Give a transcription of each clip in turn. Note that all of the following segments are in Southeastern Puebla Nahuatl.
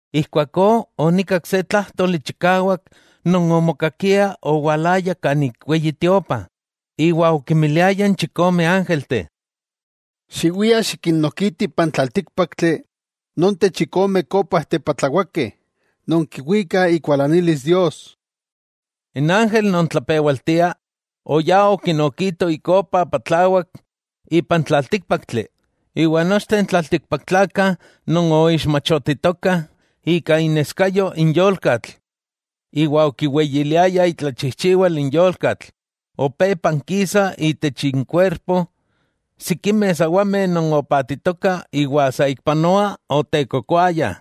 Ijkuakó onikak se tlájtoli chikawak non omokakia owalaya kanik Weyi Tiopa, iwa okimiliaya n chikome ángelteh: —Xiwiah xikinnokitih ipan tlaltíkpaktli nonteh chikome kópajteh patlawakeh non kiwikah ikualanilis Dios. N ángel non tlapewaltia oyá okinokito ikopa patlawak ipan tlaltíkpaktli, iwa nochteh n tlaltikpaktlakah non oixmachotitokah ika ineskayo n yolkatl iwa okiweyiliayah itlachijchiwal n yolkatl, opé pankisah itech inkuerpo sikimeh sawameh non opatitokah iwa saikpanoa otekokoayah.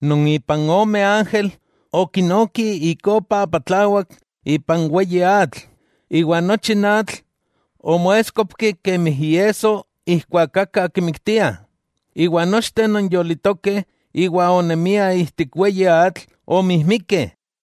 Non ipan ome ángel okinoki ikopa patlawak ipan weyi atl, iwa nochi n atl omoéskopki kemi iesso ijkuak aka kimiktiah, iwa nochteh non yolitokeh iwa onemiah ijtik weyi atl, omijmikeh.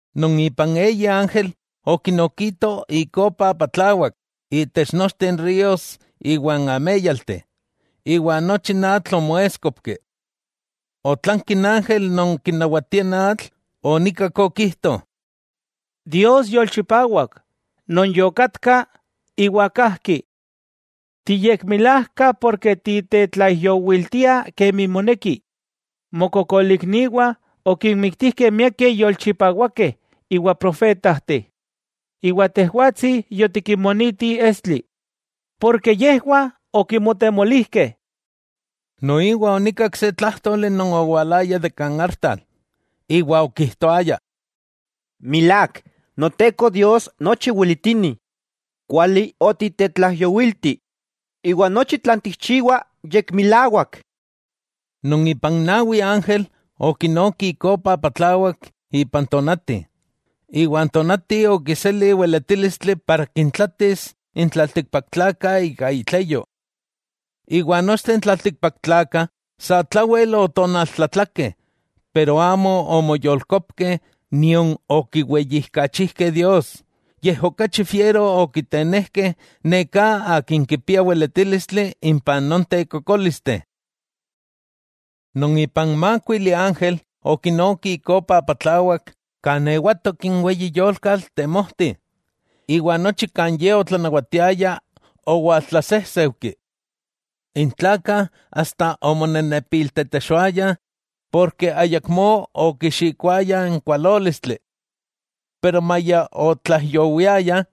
Non ipan eyi ángel okinokito ikopa patlawak intech nochteh ríos iwa n améyalteh, iwa nochi n atl omoéskopki. Otlanki n ángel non kinawatia n atl, onikak okijto: —Dios, Yolchipawak, Non yokatka, iwa kajki. Tiyekmilajka ken titetlaijyowiltia kemi moneki. Mokokolikniwah okinmiktijkeh miakeh yolchipawakeh iwa profetajteh, iwa Tejwatsi yotikinmoniti estli, ¡porke yejwah okimotemolijkeh! Noiwa onikak se tlájtoli non owalaya de kan artal, iwa okijtoaya: —¡Milák, Noteko Dios nochi weletini, kuali otitetlaijyowilti, iwa nochi tlan tikchiwa, yekmilawak! Non ipan nawi ángel okinoki ikopa patlawak ipan tonati, iwa n tonati okiseli weletílistli para kintlatis n tlaltikpaktlakah ika itleyo. Iwa nochteh n tlaltikpaktlakah satlawel otonaltlatlakeh, iwa amo omoyolkopkeh nion okiweyijkachijkeh Dios, yej okachi fiero okitenejkeh neká Akin kipia weletílistli impah nonteh kokólisteh. Non ipan mákuili ángel okinoki ikopa patlawak kan ewatok n weyi yolkatl temojti, iwa nochi kan ye otlanawatiaya owaltlasejseujki. N tlakah omonenepiltetexoayah ken ayakmó okixikoayah n kualólistli. Maya otlaijyowiayah,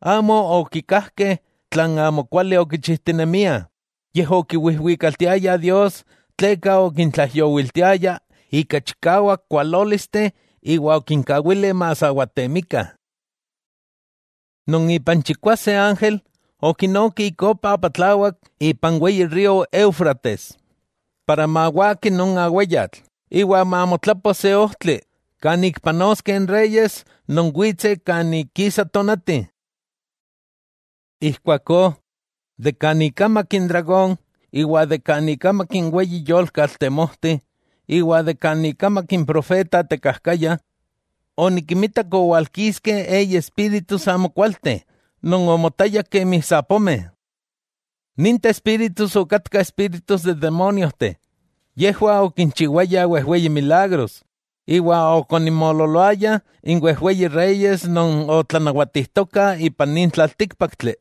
amo okikajkeh tlan amokuali okichijtinemiah, yej okiwijwikaltiayah Dios tleka okintlaijyowiltiaya ika chikawak kualólisteh iwa okinkawili masawatemikah. Non ipan chikwase ángel okinoki ikopa patlawak ipan weyi río Éufrates, para mawaki non aweyatl iwa mamotlapo se ojtli kan ik panoskeh n reyes non witseh kan ik kisa tonati. Ijkuakó, kan ikamak n dragón, iwa kan ikamak n weyi yolkatl temojti, iwa kan ikamak n profeta tekajkaya, onikimitak owalkiskeh eyi espíritus amokualteh non omotayah kemi sapomeh. Ninteh espíritus okatkah espíritus n demóniojteh. Yejwah okinchiwayah wejweyi milagros, iwa okoninmoololoayah n wejweyi reyes non otlanawatijtokah ipan nin tlaltíkpaktli,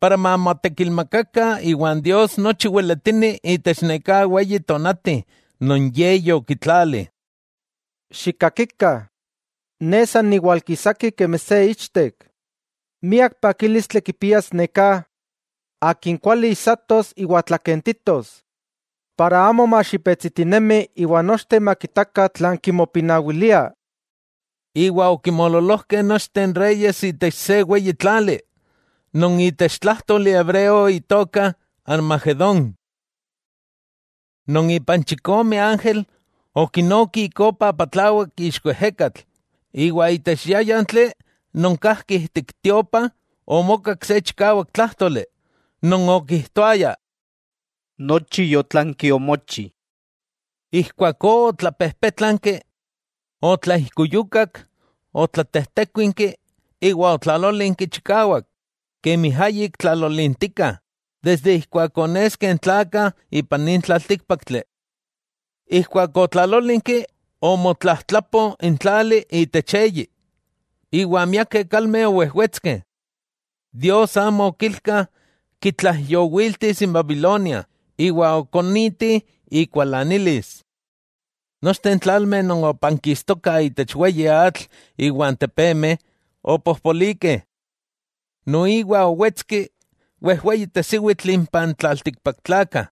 para mamotekilmakakah iwa n Dios nochi weletini itech neká weyi tonati non Ye yokitlali. “Xikakikah, ne san niwalkisaki kemi se ichtek. Miak pakílistli kipias neká akin kuali ijsatos iwa tlakentitos, para amo maxipetsitinemi iwa nochteh makitakah tlan kimopinawilia.” Iwa okinmoololojkeh nochteh n reyes itech se weyi tlali non itech tlájtoli hebreo itoka Armagedón. Non ipan chikome ángel okinoki ikopa patlawak ixko ejekatl, iwa itech yáyantli non kajki ijtik tiopa omokak se chikawak tlájtoli, non okijtoaya: —¡Nochi yotlanki omochi! Ijkuakó otlapejpétlanki, otlaijkuyukak, otlatejtékuinki, iwa otlalólinki chikawak, kemi ayik tlalolintika desde ijkuak oneskeh n tlakah ipan nin tlaltíkpaktli. Ijkuak otlalolinki omotlajtlapo n tlali itech eyi, iwa miakeh kalmeh owejwetskeh. Dios amo okilka kitlaijyowiltis n Babilonia, iwa okoniti ikualanilis. Nochteh n tlalmeh non opankistokah itech weyi atl iwa n tepemeh opojpolikeh. Noiwa owetski wejweyi tesiwitl impa n tlaltikpaktlakah.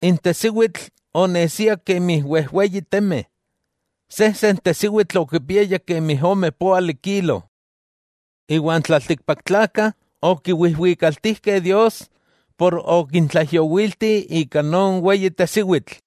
N tesiwitl onesia kemi wejweyi temeh, sejsen tesiwitl okipiaya kemi ome póali kilo. Iwa n tlaltikpaktlakah okiwijwikaltijkeh Dios ken okintlaijyowilti ika non weyi tesiwitl.